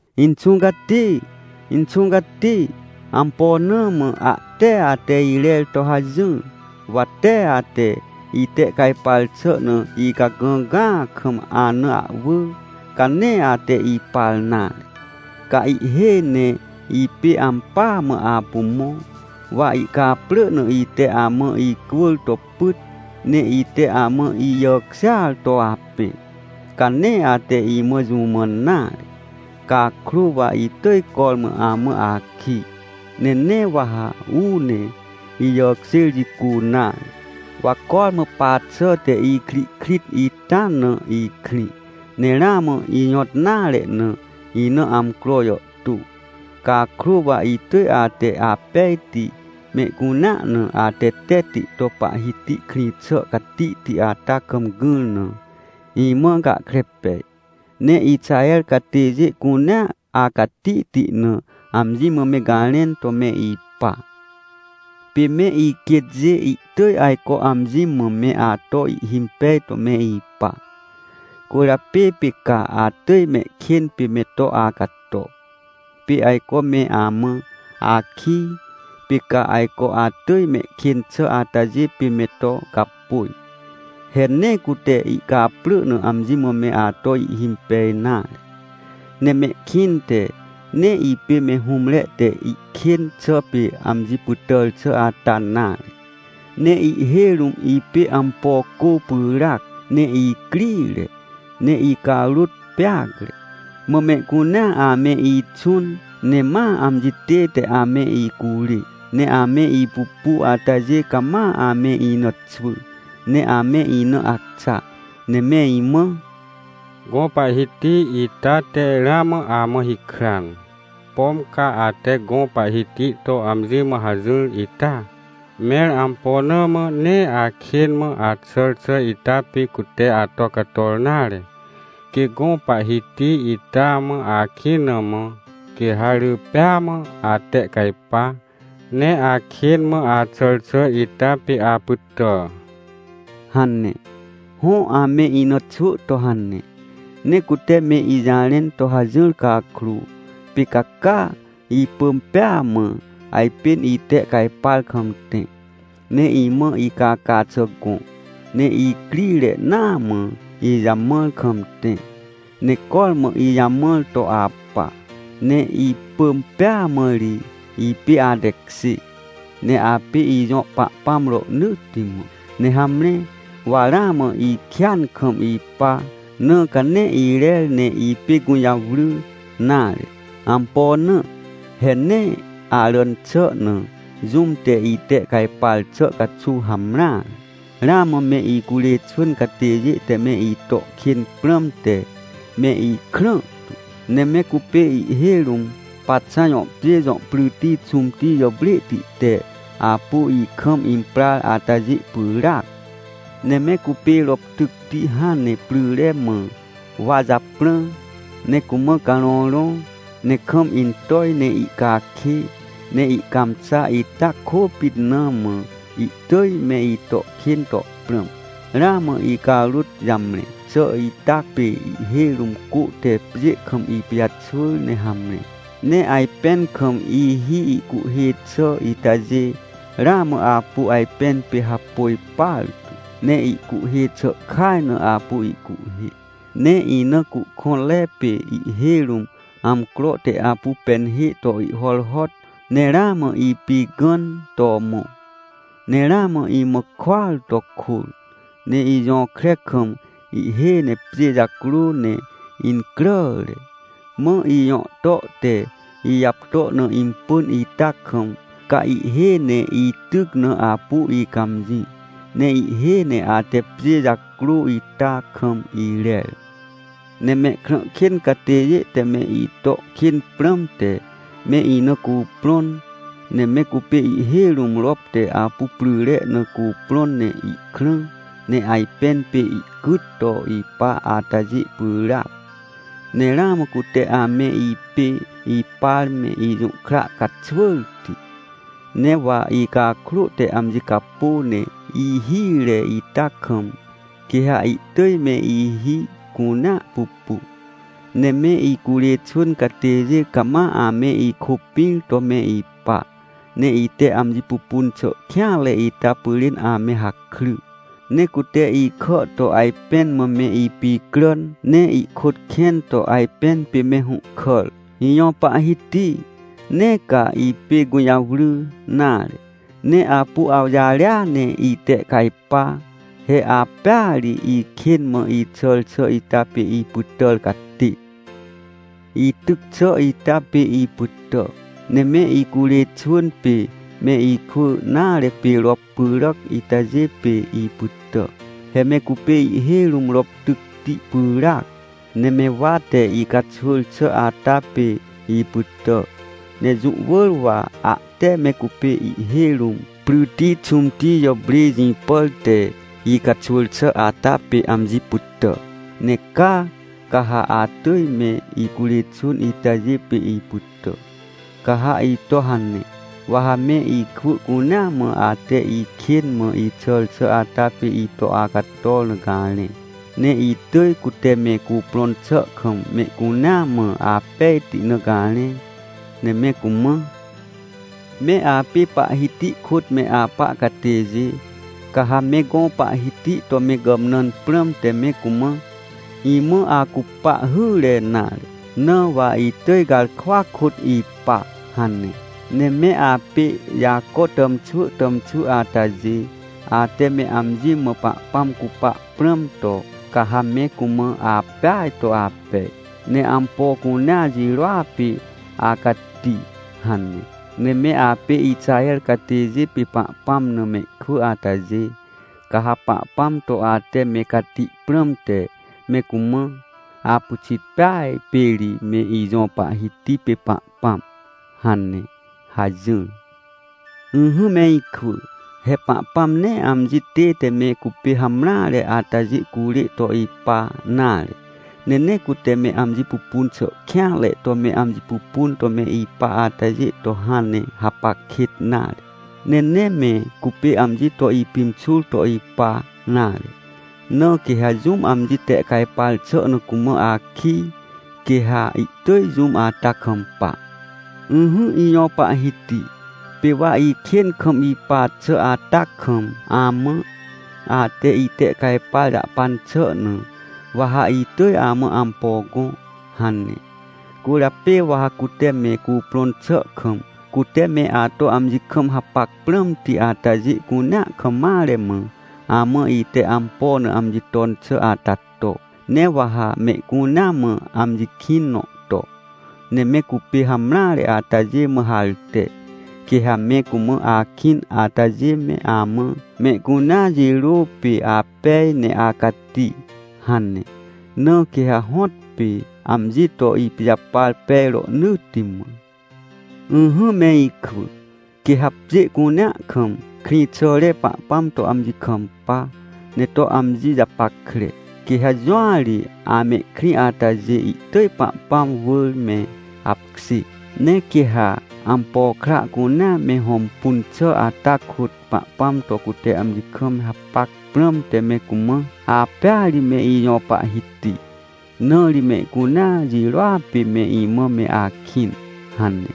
Inxũ Cati! Inxũ Cati! Ampo na mã ahte ate irer to hajỹr? Wa tee ate itehcajpar xà na icagãgãa kam ana ahwỳ, ca nee ate ipar nare! Ca ihhêj ne ipê ampỳa mã apu mõ. Wa ihcaprỳ na ite amã icwỳr to pyt, ne ite amã ijàkjêar to apẽ, ca nee ate imã jũ mãn nare. Cakrô wa itỳj cormã amã akij, ne nee wa ha uu ne ijàkjêr jicu nare. Wa cormã pa xàhte ikrihkrit ita na ikrĩ, ne ramã ijõt nare na, ina amcro jàhtô. Cakrô, wa itỳj ate apejti, mehcunea na atetetti to Pahhiti krĩ xà catihti ata kam gỹr na, imã gahkre pej. Ne Ixaher catêjê cunea acatihti na amji mã me garẽn to me ipa. Pê me iquêtjê ihtỳj ajco amji mã me ato ihhimpej to me ipa, cwỳrjapê pê ca atỳj mehkên pê me to acato. Pê ajco me amã akij, pê ca ajco atỳj mehkên xà atajê pê me to gapôj. He nee cute ihcaprỳ na amji mã me ato ihhimpej nare. Ne mehkĩnte nee ipê me hũmre te ihkên xà pê amji pytàr xà ata nare. Ne ihhêj rũm ipê ampo cô pyràac, ne icrire, ne icarôt peacre. Mã mehcunea ame ixũn, ne ma amji tête ame icurê. Ne ame ipupu atajê cama ame ina xwỳ, ne ame ina acxa, ne me imã: “Gõ Pahhiti ita te ramã amã hikran! Pom ca ate gõ Pahhiti to amji mã hajỹr ita? Mẽr ampo na mã nee akên mã axàr xà ita pê cute ato cator nare? Quê gõ Pahhiti ita mã akĩn na mã, quê ha rỳ pêa mã atehcajpa, ne akên mã axàr xà ita pê apytà!” hane. Hõ, ame ina xwỳ to hane. Ne cute me ijarẽn to hajỹr cakrô, pê ca caa, ipỳm pêa mã, ajpên itehcajpar kam tẽ, ne imã icaca xà gõ, ne icrire naa mã ijamãr kam tẽ, ne cormã ijamãr to apa. Ne ipỳm pêa mã ri, ipê atekjê, ne apê ijõ Pahpãm rohnỳtti mã. Ne hamre, wa ramã ikêan kam ipa, na ca nee irer ne ipê gũjawry nare. Ampo na? He nee aràn xà na jũm te itehcajpar xà caxuw hamreare. Ramã me icurê xwỳn catêjê te me ito kên prãmte me ikrãhtu, ne me cupê ihhêj rũm Paxã jõ pjê jõ pryti xũmti jàprêhti te apu ikam imprar atajê pyràac. Ne me cupê rop tycti hãn ne pryre mã wa japrã, ne cumã carõrõ, ne kam intoj ne ihcakê, ne ihcãmxa ita kôpit na mã, ihtỳj me ito kên to prãm. Ramã icarôt jamre xà ita pê ihhêj rũm cô te pjê kam ipijaxwỳr ne hamre. Ne ajpẽn kam ihi ihcuhhê xà itajê, ramã apu ajpẽn pê hapôj partu, ne ihcuhhê xà kaj na apu ihcuhhê. Ne ina cuhkõnre pê ihhêj rũm amcro te apu penhê to ihhorhot, ne ramã ipigãn to mõ. Ne ramã imã kôar to kôr, ne ijõkre kam ihhêj ne pjê jacrô ne incràre. Mã ijõhto te ijapto na impỳn ita kam, ca ihhêj ne ityc na apu icãmjĩ, ne ihhêj ne ate pjê jacrô ita kam irer. Ne mehkrã kên catêjê te me ito kên prãmte, me ina cuprõn. Ne me cupê ihhêj rũm rop te apu pryre na cuprõn ne ihkrã, ne ajpẽn pê ihcyt to ipa atajê pyràac. Ne ramã cute ame ipê ipar me ijũhkra caxwỳrti. Ne wa icakrô te amji capô, ne ihire ita kam, quê ha ihtỳj me ihi cunea pupu. Ne me icurê xwỳn catêjê cama ame ikôpĩr to me ipa, ne ite amji pupun xà kêanre ita pyrên ame hakry. Ne cute ikà to ajpẽn mã me ipicràn, ne ihkôt kẽn to ajpẽn pê me hũhkàr. Ijõ Pahhiti! Nee ca ipê gũjawry nare, ne apu awjarêa ne itehcajpa! He apêa ri ikên mã ixàr xà ita pê ipytàr catê! Ityc xà ita pê ipytà! Ne me icurê xwỳn pê me ikwỳ nare pê rop pyràc itajê pê ipytà. He me cupê ihhêj rũm rop tycti pyràac, ne me wa te icaxwỳr xà ata pê ipytà! Ne jũ wỳr wa ahte me cupê ihhêj rũm pryti xũmti jàprê jĩpàr te icaxwỳr xà ata pê amji pytà! Ne caa, ca ha atỳj me icurê xwỳn itajê pê ipytà! Ca ha ito hane, wa ha me ikwỳ cunea mã ate ikên mã ixàr xà ata pê ito acator na garẽ, ne itỳj cute me cuprõn xà kam mehcunea mã apejti na garẽ, ne me cumã: “Me apê Pahhiti kôt me apa catêjê, ca ha me gõ Pahhiti to me gàmnãn prãmte me cumã: ‘Imã acupa hyre nare, na wa itỳj garkwa kôt ipa!’ hane. Ne me apê Jaco tàmxwỳ tàmxwỳ atajê, ate me amji mã Pahpãm cupa prãm to, ca ha me cumã: ‘Apeaj to apej! Ne ampo cunea jirôa pê acati!’ hane. Ne me apê Ixaher catêjê pê Pahpãm na mehkwỳ atajê, ca ha Pahpãm to ate me cati prãmte me cumã: ‘Apyxit peaj pê ri me ijõ Pahhiti pê Pahpãm!’ hane” hajỹr. Ỹhỹ me ikwỳ, he Pahpãm nee amji tête me cupê hamreare atajê curê to ipa nare. Ne nee cute me amji pupun xà kêanre to me amji pupun to me ipa atajê to hãn ne hapac kêt nare. Ne nee me cupê amji to ipimxur to ipa nare. Na quê ha jũm amji tehcajpar xà na cumã akij, quê ha ihtỳj jũm ata kampa. Ỹhỹ Ijõ Pahhiti, pê wa ikên kam ipa xà ata kam amã: “Ate itehcajpar jahpan xà na, wa ha itỳj amã ampo gõ” hane. Cwỳrjapê wa ha cute me cuprõn xà kam, cute me ato amji kam hapac prãmti atajê cunea kam mare mã, amã ite ampo na amji ton xà ata to. Ne wa ha mehcunea mã amji kĩn nõ to, ne me cupê hamreare atajê mã harte. Quê ha me cumã akĩn atajê me amã: “Mehcunea jirô pê apej ne acati” hane. Na quê ha hõtpê amji to ipijapar pej rohnỳtti mã. Ỹhỹ me ikwỳ, quê ha pjê cunea kam krĩxàre Pahpãm to amji kampa, ne to amji japackre. Quê ha jũa ri amehkrĩ atajê, ihtỳj Pahpãm wỳr me apkjê. Ne quê ha ampo kra cunea me hõmpun xà ata kôt, Pahpãm to cute amji kam me hapac prãmte me cumã: “Apêa ri me ijõ Pahhiti, na ri mehcunea jirôa pê me imã me akĩn” hane.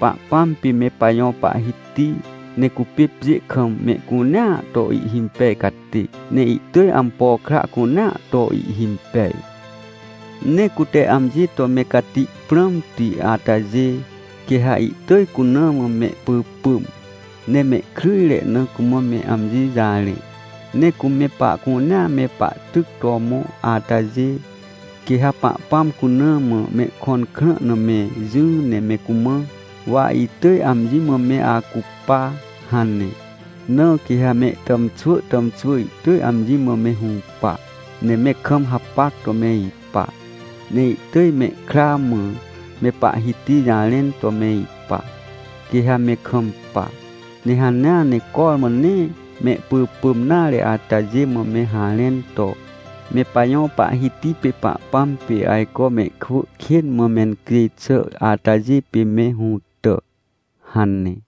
Pahpãm pê me pajõ Pahhiti, ne cupê pjê kam mehcunea to ihhimpej catê, ne ihtỳj ampo kra cunea to ihhimpej. Ne cute amji to me cati prãmti atajê, quê ha ihtỳj cuna mã mehpỳpỳm, ne mehkryjre na cumã me amji jarẽ. Ne cu me pahcunea me pahtyc to mõ atajê, quê ha Pahpãm cuna mã mehkõn krã na me jỹ ne me cumã: “Wa itỳj amji mã me acupa” hane. Na quê ha mehtàmxwỳ tàmxwỳ ihtỳj amji mã me hũpa, ne me kam hapac to me ipa, ne ihtỳj mehkra mã me Pahhiti jarẽn to me ipa. Quê ha me kampa, ne hanea ne cormã nee mehpỳpỳm nare atajê mã me harẽn to: “Me pajõ Pahhiti pê Pahpãm pê ajco mehkwỳ kên mã mencjêj xà atajê pê me hũtà” hane.